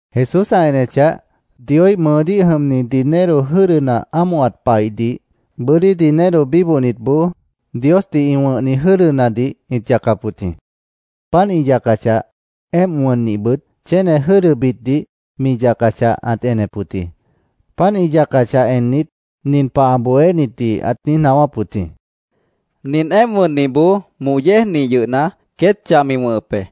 Jesús ã enechah, Dioíh mʉʉdíh jʉmni dinero jʉ́dʉna ámohat paihdih bʉ́dí dinero bíbohnitboó Diosdih ĩ wʉ̃hni jʉ́dʉnadih ĩt yacap wʉt jĩ. Páant ĩ yacachah, éemp wʉnnihbʉt chéne jʉ́dʉbitdih mi yacachah, ãt enep wʉt jĩ. Páant ĩ yacachah ennit, nin pah ã bohénitdih ãt niíj naáwáp wʉt jĩ: —Nint éemp wʉnnihboó moh yéejnih yʉhna, queét chah mi wʉ̃hʉp be.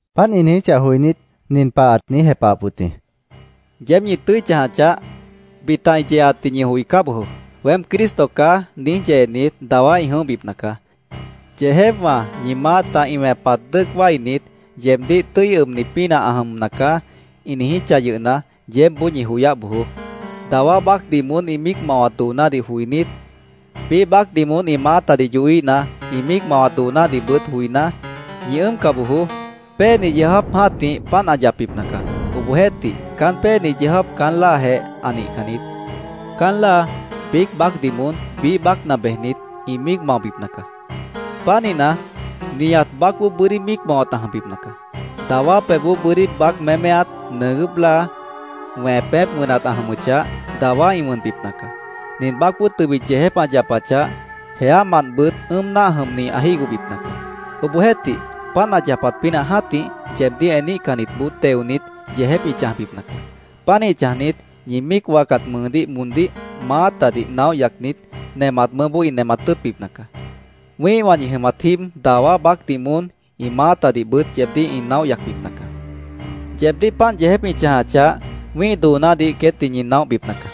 Páant ĩ niijíchah joinít, nin pah ãt niíj jepahap wʉt jĩ: “¡Yeéb ñi tʉ́i chãja chaáh! Bita ĩ yeeatdih ñi joicá bojoó. ‘Weém Cristo caá’, niíj yeenit, dawá ĩ jʉ̃óhbipna caá. ‘Yeejépwã ñi maáta ĩ wẽpat dʉ́ʉc wáinit, yeebdíh tʉ́i ʉbni pínah ã jʉmna caá’, ĩ niijíchah yʉhna, yeébboó ñi joyáh bojoó. Dawá baácdih moón ĩ míic mawat doonádih joinít, biíh baácdih moón ĩ maátadih yohíhna, ĩ míic mawat doonádihbʉt joiná, ñi ʉ́ʉmca bojoó. Péeni yeó jáap jã́tih páant ã yapbipna caá. Obohjeéhtih, caán péeni yeó jáap caán láajeh ã nihcan niít. “Caán láa biíc baácdih moón biíh baácna bejnit, ĩ míic maobipna caá. Pánihna, nihat baácboó bʉ́dí míic mawat ã jʉmbipna caá. Dawá pebhboó bʉ́dí baác méméat, nʉʉgʉ́p láa, wẽpép wʉnat ã jʉmʉchah, dawá ĩ wʉnbipna caá. Nin baácboó tʉbit yeejép ã yapachah, jeámantbʉt ʉ́ʉm náah jʉmni ã jígohbipna caá. Obohjeéhtih, páant ã yapat pínah jã́tih, yeebdíh eníhcannitboó teonit, yeejép ĩ chãjbipna caá. Pánih chãjnit, ñi míic wáacat mʉʉdíh moón maátadih naóh yacnit, nemat mʉʉ́boó ĩ nemat tʉ́ʉtbipna caá. Wĩ́ihwã ñi jʉmat jíib dawá baácdih moón ĩ maátadihbʉt yeebdíh ĩ naóh yacbipna caá. Yeebdíh páant yeejép ĩ chãjachah, wĩ́ih doonádih queétdih ñi naóhbipna caá.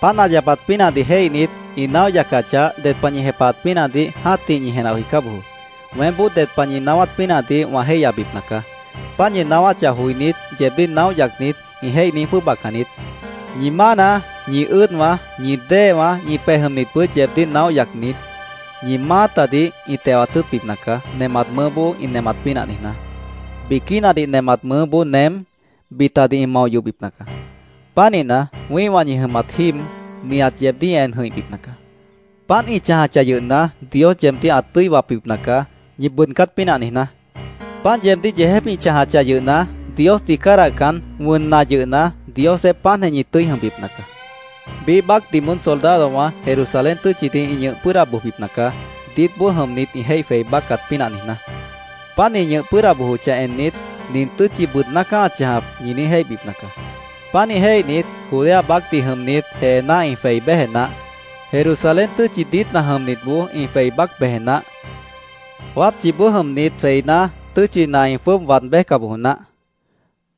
Páant ã yapat pínahdih jéihnit, ĩ naóh yacachah, ded pah ñi jepahat pínahdih jã́tih ñi jenah joicá bojoó. Weémboó ded pah ñi naáwát pínahdih wã jéihyabipna caá. Páant ñi naáwáchah joinít, yeebdíh naóh yacnit ĩ jéih niíj jwʉ́ʉbacan niít. Ñi mána, ñi ʉ́ʉdwã, ñi déewã, ñi pej jʉmnitbʉt yeebdíh naóh yacnit, ñi maátadih ĩ tewat tʉ́ʉtbipna caá, nemat mʉʉ́boó ĩ nemat pínah niijná. Biquínadih nemat mʉʉ́boó nem, bitadih ĩ mao yohbipna caá. Pánihna, wĩ́ihwã ñi jʉmat jíib, nihat yeebdíh ĩ en jʉ̃ihbipna caá. Páant ĩ chãjachah yʉhna, Dios yeebdíh ã tʉ́i wapbipna caá, ñi bʉʉdcát pínah niijná. Páant yeebdíh yeejép ĩ chãjachah yʉhna, Diosdih cádahcan, wʉnna yʉhna, Diosjeéh páantjeh ñi tʉ́i jʉmbipna caá. “Biíh baácdih moón soldadowã Jerusalén tʉ́tchidih ĩ ñʉh pʉ́ʉda bojbipna caá, diítboó jʉmnit ĩ jéih jwei báccat pínah niijná. Páant ĩ ñʉh pʉ́ʉda bojochah ennit, ‘Nin tʉ́tchi bʉʉdná caá ã chãjap’, ñi niíj jéihbipna caá. Pánih jéihnit, Judea baácdih jʉmnit jeená ĩ jwei béje naáh. Jerusalén tʉ́tchi diítna jʉmnitboó ĩ jwei bác beje naáh. Wápchiboó jʉmnit jweiná, tʉ́tchina ĩ jwʉ́ʉb waad béjca bojo naáh.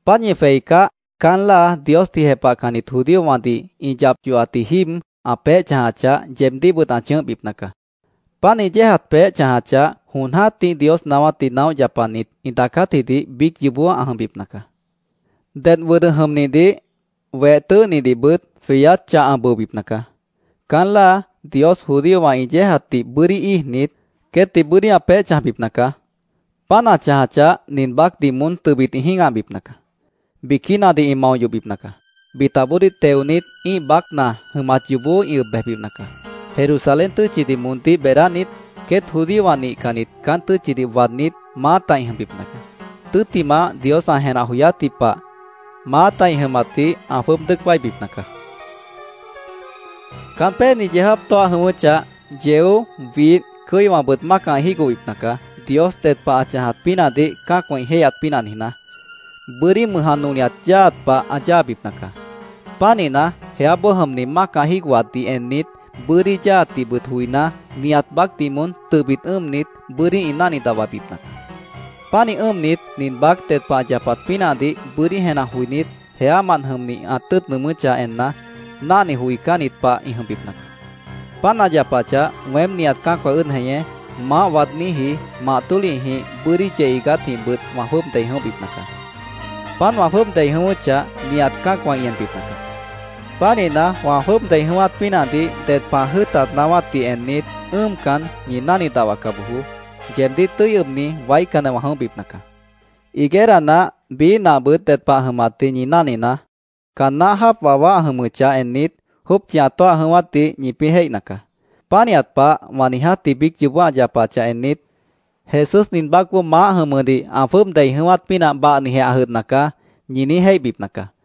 Páant ñi jweicáh, caán láa Diosdih jepahcannit judíowãdih ĩ yap yohatji jíib ã peéh chãjachah, yeebdíhbʉt ã chʉ̃ʉ́hbipna caá. Páant ĩ yéejat peéh ã chãjachah, jon jã́tih Dios naáwátdih naóh yapanit ĩ daacátjidih biíc yoobó ã jʉmbipna caá. Dedh wʉdʉ jʉmnihdih, weh tʉ́ʉhnihdihbʉt jweyát chah ã bʉobipna caá. Caán láa Dios judíowã ĩ yéejatdih bʉ́dí íijnit, queétdih bʉ́dí ã peéh chãjbipna caá. Páant ã chãjachah, nin baácdih moón tʉbit ĩ jĩ́gahbipna caá. Biquínadih ĩ mao yohbipna caá. Bitaboodíh teonit, ĩ́ih baácna jʉmat yoobó ĩ ʉb bejbipna caá. Jerusalén tʉ́tchidih moondíh beedánit, queét judíowã nihcannit caán tʉ́tchidih waadnít, maáta ĩ jʉmbipna caá. Tʉ́ttimah, Dios ã jenah joyátji pah, maáta ĩ jʉmatdih ã jwʉ́ʉb dʉ́ʉc wáibipna caá”, Jesús ãt niijíp wʉt jĩ. “Caán péeni yeó jáap tóah jʉ̃ʉ́wʉ́chah, yeó, widh, cʉ́iwãbʉt mácah ĩ jígohbipna caá, Dios ded pah ã chãjat pínahdih cã́acwã ĩ jéihyat pínah niijná. Bʉ́dí mʉj ã nolihat yáaat pah ã yáabipna caá. Pánihna, jeáboó jʉmni mácah jígohatdih ennit, bʉ́dí yáaatdihbʉt joiná, nihat baácdih moón tʉbit ʉ́ʉmnit, bʉ́dí ĩ náhni dahwabipna caá. Pánih ʉ́ʉmnit, nin baác ded pah ã yapat pínahdih bʉ́dí jenah joinít, jeámant jʉmni ã tʉ́ʉt nʉʉmʉ́chah enna, náhni joicánnit pah ĩ jʉmbipna caá. Páant ã yapachah, weém nihat cã́acwã ʉ́ʉd jeñé, maáh waadníji, mah tólihjĩh, bʉ́dí yeh iigátjĩhbʉt wã jwʉ́ʉb dei jʉ̃óhbipna caá. Páant wã jwʉ́ʉb dei jʉ̃ʉ́wʉ́chah, nihat cã́acwã ĩ enbipna caá. Pánihna, wã jwʉ́ʉb dei jʉ̃ʉ́wát pínahdih ded pah ã jʉ́ʉt waáwátdih ennit, ʉ́ʉmcan, ñi náhni dahwaca bojoó. Yeebdíh tʉ́i ʉbni waícanjeh wã jʉ̃óhbipna caá. “Higuera nah, biíh nahbʉt ded pah ã jʉmatdih ñi náhninaá. Caan náh jáap wawá ã jʉmʉchah ennit, jópchi ã tóah jʉ̃ʉ́wátdih ñipĩ́ jéihna caá. Pánihat pah wã niijátji biíc yoobó ã yapachah ennit, ‘Jesús nin baácboó maáh jʉmʉdih ã jwʉ́ʉb dei jʉ̃ʉ́wát pínah bahnijeh ã jʉdhna caá’, ñi niíj jéihbipna caá.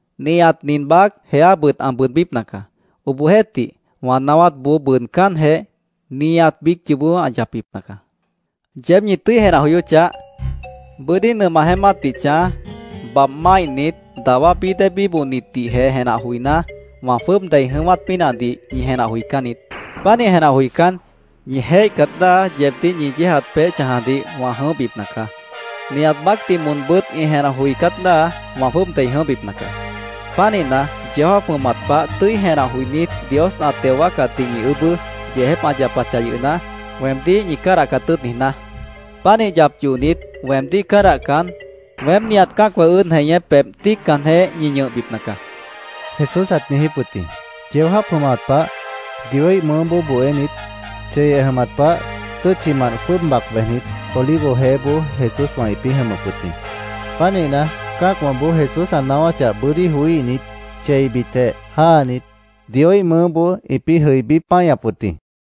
Nihat nin baác jeábʉt ã bʉʉdbípna caá. Obohjeéhtih, wã naáwátboó bʉʉdcánjeh, nihat biíc yoobó ã yapbipna caá. “¡Yeéb ñi tʉ́i jenah joyó chaáh! Bʉ́dí nʉmah jeémátdih chãj, babh máihnit, dawá bií déedih bíbohatdihjeh jenah joiná, wã jwʉ́ʉb dei jʉ̃ʉ́wát pínahdih ñi jenah joicán niít. Pánih jenah joicán, ñi jéihcat láa yeebdíh ñi yéejat peéh chãjadih wã jʉ̃óhbipna caá. Nihat baácdih moonbʉ́t ĩ jenah joicát láa wã jwʉ́ʉb dei jʉ̃óhbipna caá. Pánihna, yeó jáap jʉmat pah tʉ́i jenah joinít, Dios ã teo wáacatdih ñi ʉʉ́bʉ́, yeejép ã yapachah yʉhna, weemdíh ñi cádahcat tʉ́ʉt niijná. Pánih yap yohnit, weemdíh cádahcan, weém nihat cã́acwã ʉ́ʉd jeñé pebh tíiccanjeh ñi ñʉhbipna caá”, Jesús ãt niijíp wʉt jĩ. Yeó jáap jʉmat pah Dioíh mʉʉ́boó bohénit, cheyeh jʉmat pah tʉ́tchimant jwʉ́ʉb bac bejnit, Olivo Jeéboó Jesúswã ĩpĩ́ jʉmʉp wʉt jĩ. Pánihna, cã́acwãboó Jesús ã naáwáchah bʉ́dí joííhnit, cheibitjeh jáanit, Dioíh mʉʉ́boó ĩpĩ́ jʉibí páñap wʉt jĩ.